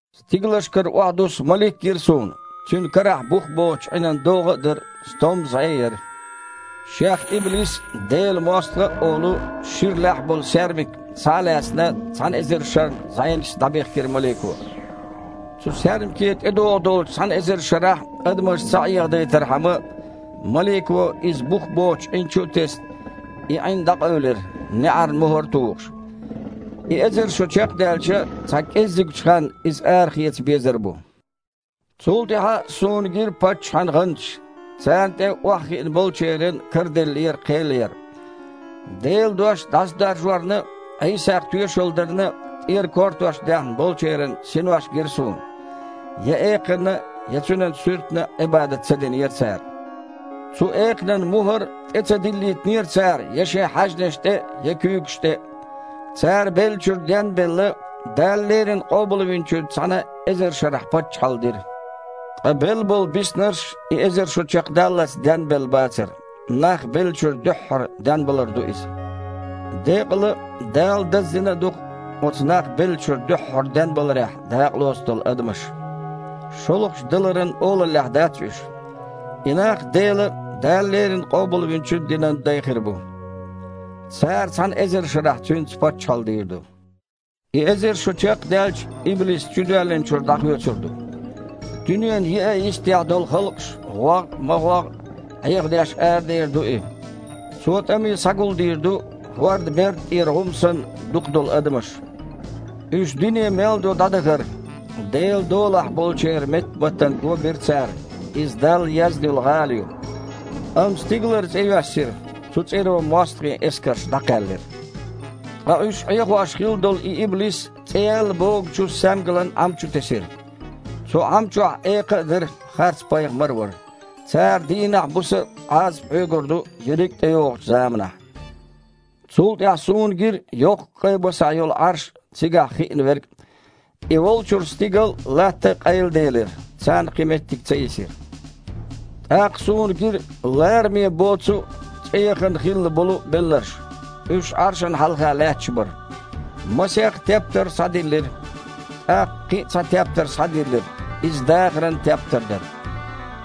Стигалшкара охьадуссу малик гира суна. Цуьнан карахь бух боцучу Іинан догІа а дара, стомма зІе а яра. Шех иблис а, Делан мостагІа а олу, шира лаьхьа болу саьрмик, схьа а лаьцна, цхьана эзар шарна зІенашца дІабихкира малико. Цу саьрмике тІедогІу долчу цхьана эзар шарахь адамаш ца Іехадайтархьама, малико, иза бух боцучу Іин чу а тесна, и Іин дІакъевлира, неІарна мухІар а тухуш. И эзар шо чекхдаьлча, цхьа кІеззигчу ханна иза арахеца безар бу. Цул тІаьхьа суна гира паччахьан гІанташ. Царна тІе охьахиъна болчеран караделлера кхел яр. Делан дош дІасадаржорна а, Іийсах тоьшалла дарна а тІера кортош даьхна болчеран синош а гира суна. Я экханна а, я цуьнан суьртана а Іибадат ца динера цара. Цу экханан мухІар а тІе ца диллийтинера цара я шайн хьаьжнаш тІе а, я куьйгаш тІе а. Цара, беллачуьра ден а белла, Дала леррина Къобалвинчуьнца цхьаьна эзар шарахь паччахьалла дира. (Ткъа белла болу биснарш и эзар шо чекхдаллалц денбелла бацара.) Нах беллачуьра дуьххьара денбалар ду иза. Декъала а, Дала даздина а ду-кх оцу нах беллачуьра дуьххьара денбаларехь дакъалоцу долу адамаш. ШолгІачу даларан олаллехь дац уьш. И нах Делан а, Дала леррина Къобалвинчун а динан дай хир бу. Цара цхьана эзар шарахь Цуьнца паччахьалла дийр ду. И эзар шо чекхдаьлча, иблис чудоьллинчуьра дІахоьцур ду. Дуьненан еа а йистехь долу халкъаш, ГІогІ а, МагІогІ а, Іехадеш арадер ду и. Цо тІаме схьагулдийр ду, хІордан берда тІера гІум санна, дукха долу адамаш. Уьш дуьне мел ду дІадахара. Делан долахь болчеран меттаматтана го бира цара – иза Далла езна йолу гІала ю. Амма стигалара цІе йоьссира, цу цІеро мостагІийн эскарш дІакхаьллира. Ткъа уьш Іехош хилла долу и иблис цІе яьлла богучу саьмгалан Іам чу тесира. Цу Іам чохь экха а дара, харцпайхамар а вара. Цара дийнахь а, буса а Іазап хьоьгур ду ерриг а тІейогІучу заманахь. Цул тІаьхьа суна гира йоккха кІайн басахь йолу Іарш а, цигахь хиъна Верг а. И волчуьра стигал а, латта а къайладелира, царна кхин меттиг ца йисира. ТІаккха суна гира лараме боцу а, цІеяхана хилла болу а белларш. Уьш Іаршана хьалха лаьтташ бара. Масех тептар схьадиллира. ТІаккха кхин а цхьа тептар схьадиллира – иза дахаран тептар дара.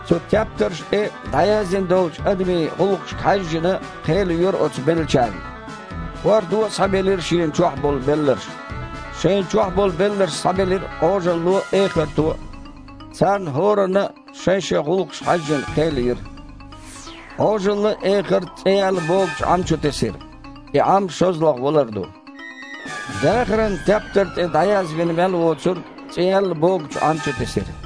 Цу тептаршна тІе дІаяздина долчу адамийн гІуллакхашка хьаьжжина, кхел йора оцу беллачарна. ХІордо а схьабелира шена чохь болу белларш. Шайна чохь болу белларш схьабелира Іожалло а, эхарто а. Царна хІоранна а, шайн-шайн гІуллакхашка хьаьжжина, кхел йира. Іожалла а, эхарт а цІе яьлла богучу Іам чу тесира. (И Іам шозлагІа валар ду.) Дахаран тептар тІе дІаязвина мел воцург цІе яьлла богучу Іам чу тесира.